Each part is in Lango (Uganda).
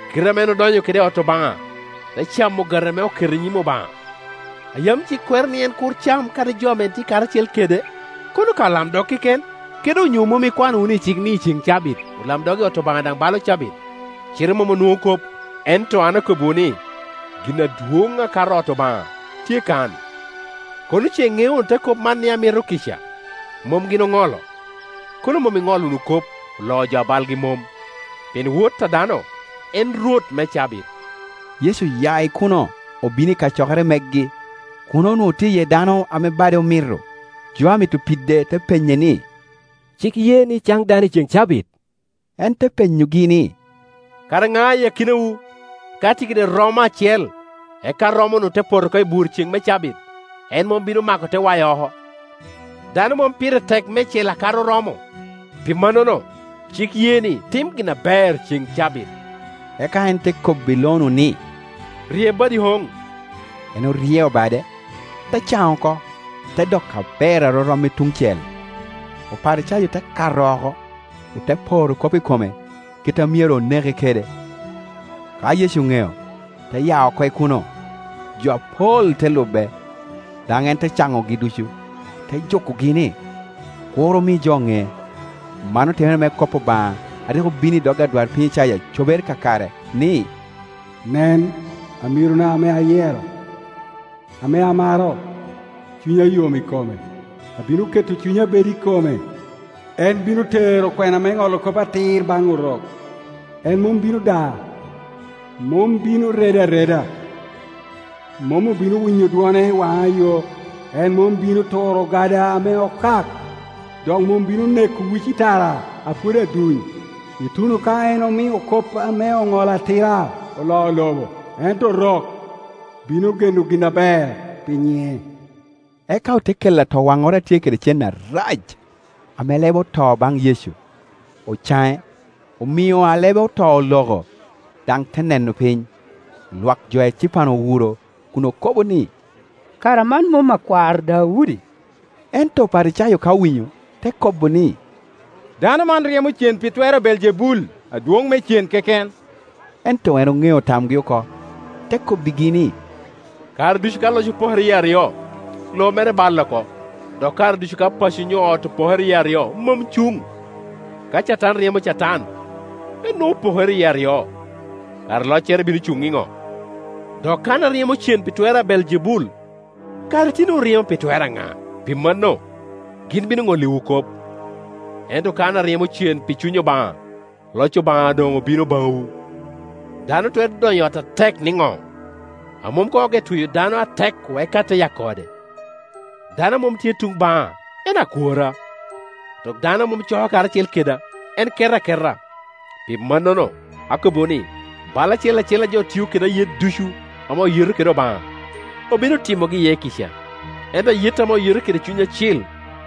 Kite ame en odonyo kede i ot Obaŋa, te camo ogati ame oketo i nyim Obaŋa, a yam cik kwero ni en kur cam, kadi jo ame tye karacel kede, kono ka olamdog keken? Kede onyo mom ikwano wunu i cik ni i ceŋ cabit olamdog i ot Obaŋa daŋ balo cabit, cite mom onwoŋo kop? Ento an akobbiwu ni, gin adwoŋ akato ot Obaŋa tye kano Kono ce iŋeo wunu te kop man, ni, ‘Amito kica, mom gin oŋolo’, kono mom iŋolo wunu kop oloo jo a balgi mom. Pien Wot a dano en rwot me cabit.” Yecu oya i kuno obino i kacokere megi. Kuno onwoŋo tye iye dano ame bade omito. Jo a mito pide te penye ni, “Cik ye ni caŋ dano i cen cabit?” En te penyogi ni, “Kara ŋa i akinawu, ka tye kede romo acel, eka romo-nu te poto oko i bur i ceŋ me cabit, en mom bino mako, te wayo oko? Dano mom pire tek meicel akato romo? Pi mannono cik ye ni tim gin aber i ceŋ cabit.” Eka en te kobbi lo-nu ni, “Rye badi oŋ,” En oryeo bade, te caŋ oko, te doko aber arorom i tuŋ cel. Oparicayo te kato oko, ote poro kop i kome, kite a myero oneke kede. Ka Yecu oŋeo, te ya oko i kuno. Jo apol te lube, daŋ en te caŋogi ducu, te jukogi ni, kur omi jo ŋe. Man otimere me kop Obaŋa a rik obino i dog adwarpiny Icaya cobere kakare, ni, “Nen amirona ame ayero, ame amaro, cunya yom i kome. Abino keto Cunya bed i kome, en bino tero kwena me ŋolo kop atir baŋ Orok. En mom bino da, mom bino redo areda, mom obino winyo dwone i waŋa yo; en mom bino turo ogada ame okak, dok mom bino neko uci tara a pwod aduny, ituno ka en omio kop ame oŋolo atir oloo lobo; ento Orok bino geno gin aber pi nyiŋe.” Eka ote kelo atowaŋŋoro a tye kede cen arac, ame lebe oto baŋ Yecu. Ocaŋe, omio alebeoto oloko, daŋ te neno piny. Lwak jo ecipan owuro kun okobo ni, “Kara man mom akwar Daudi?” Ento Oparicayo ka owinyo te kobo ni, “Dano man ryemo cen pi twer a Beeljebul, adwoŋ me cen, keken.” Ento en oŋeo tamgi oko, te kobbigi ni, “Kare ducu ka loc opokere yie aryo, lobo mere balle oko, dok kare ducu ka paco onyo ot opokere yie aryo, mom cuŋ. Ka Catan ryemo Catan, en nwoŋo opokere yie aryo; kara loccere bino cuŋ iŋo? Dok ka an aryemo cen pi twer a Beeljebul, kara itinowu ryemo pi twer aŋa? Pi manno gin bino ŋolliwu kop. Ento ka an aryemo cen pi Cuny Obaŋa, loc Obaŋa doŋ obino baŋwu. Dano twero donyo i ot a ŋat atek niŋo, a mom koŋ ogeo tweyo dano atek-ku, eka te yako ode. Dano a mom tye tuŋ baŋa en akworra, dok dano a mom coko karacel keda, en keto aketa. Pi mannono, akobbiwu ni, bal acel acel a jo tio kede ayet ducu ame oyeto kede Obaŋa, obino timogi iye kica, ento ayet ame oyeto kede Cuny Acil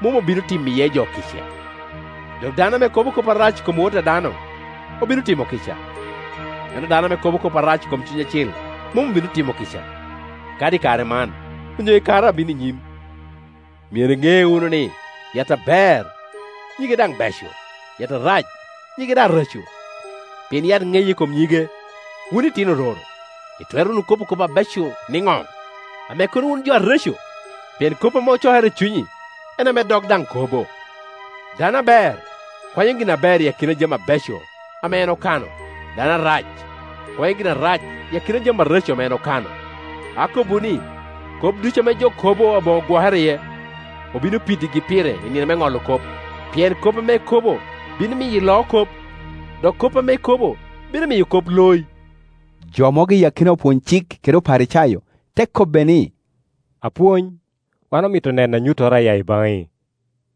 mom obino timo iye jo kica. Dok dano ame kobo kop arac i kom Wot a dano obino timo kica, ento dano ame kobo kop arac i kom Cuny Acil mom obino timo kica, kadi i kare man, onyo i kare a bino i nyim. “Myero iŋe wunu ni yat aber nyige daŋ beco, yat arac nyige daŋ reco; pien yat ŋeye I kom nyige. Wun itino ororo, itwero wunu kobo kop aber nino, ame kono wun jo areco? Pien kop ame ocokere i cunyi, en ame dog daŋ kobo. Dano aber kwanyo gin aber i akina jami abeco ame en okano dano arac kwanyo gin arac i akina jami areco ame en okano. Akobbiwu ni kop ducu ame jo kobo aboŋo gwokere iye, obino piddigi pire i nino me ŋolo kop; pien kop ame ikobo bino miyo iloo kop, dok kop ame ikobo bino miyo kop loyi.” Jo mogo i akina opwony-cik kede Oparicayo te kobbe ni, “Apwony, wan omito neno anyuttoro a ya i baŋi.”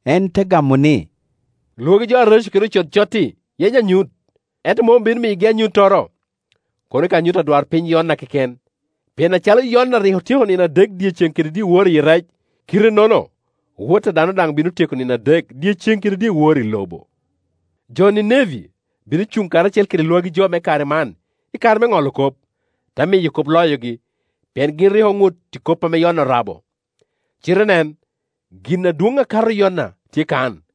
En te gamo ni, “Lwagi jo areco kede ocod cot-ti yenyo anyut, ento mom obino miyogi anyuttoro, kono ka anyut adwarpiny Yona keken. Pien acalo Yona rik otyeko nino adek, dyeceŋ kede dyewor, iyi rec, kite-nono Wot a dano daŋ bino tyeko nino adek, dyeceŋ kede dyewor, i lobo. Jo Nineve bino cuŋ karacel kede lwagi jo me kare man, i kare me ŋolo kop, te miyo kop loyogi: pien gin rik oŋut pi kop a Yona orabo, cite nen, gin adwoŋ akato Yona tye kan.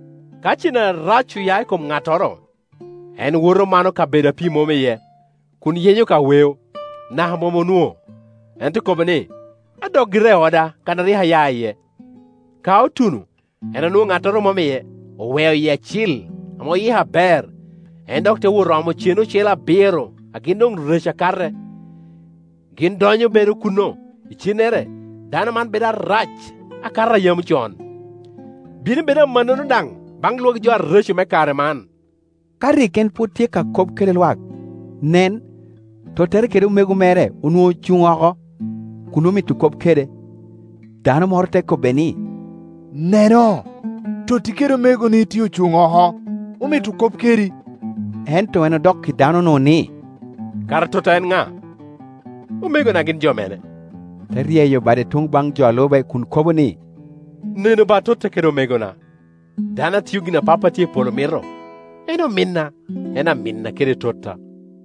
“Ka cen arac oya i kom ŋattoro, en woto mano kabedo a pii mom iye kun yenyo ka weo; naka mom onwoŋo. En te kobo ni, ‘Adok gira i oda kan a rik aya iye.’ Ka otuno, en onwoŋo ŋattoro mom iye, oweo yie acil, ame oyiko aber. En dok te wot omo cen ocele abiro a gin doŋ reco akate, gin donyo bedo kuno; icennere dano man bedo arac akato a yam con. Bino bedo amannono daŋ baŋ lwagi jo areco me kare man.” Ka rik en pwod tye ka kop kede lwak, nen, tottere kede omego mere onwoŋo ocuŋ oko, kun omito kop kede. Dano moro te kobbe ni, “Neno, totti kede omegoni tye ocuŋ oko, omito kop kedi.” Ento en odok i dano-nu ni, “Kara totta en ŋa? Omegona gin jo mene?” Te ryeyo bade tuŋ baŋ jo a lube kun kobo ni, “Nenu ba totta kede omegona! Dano a tio gin ame Pappa a tye i polo mito, en ominna, en aminna kede totta.”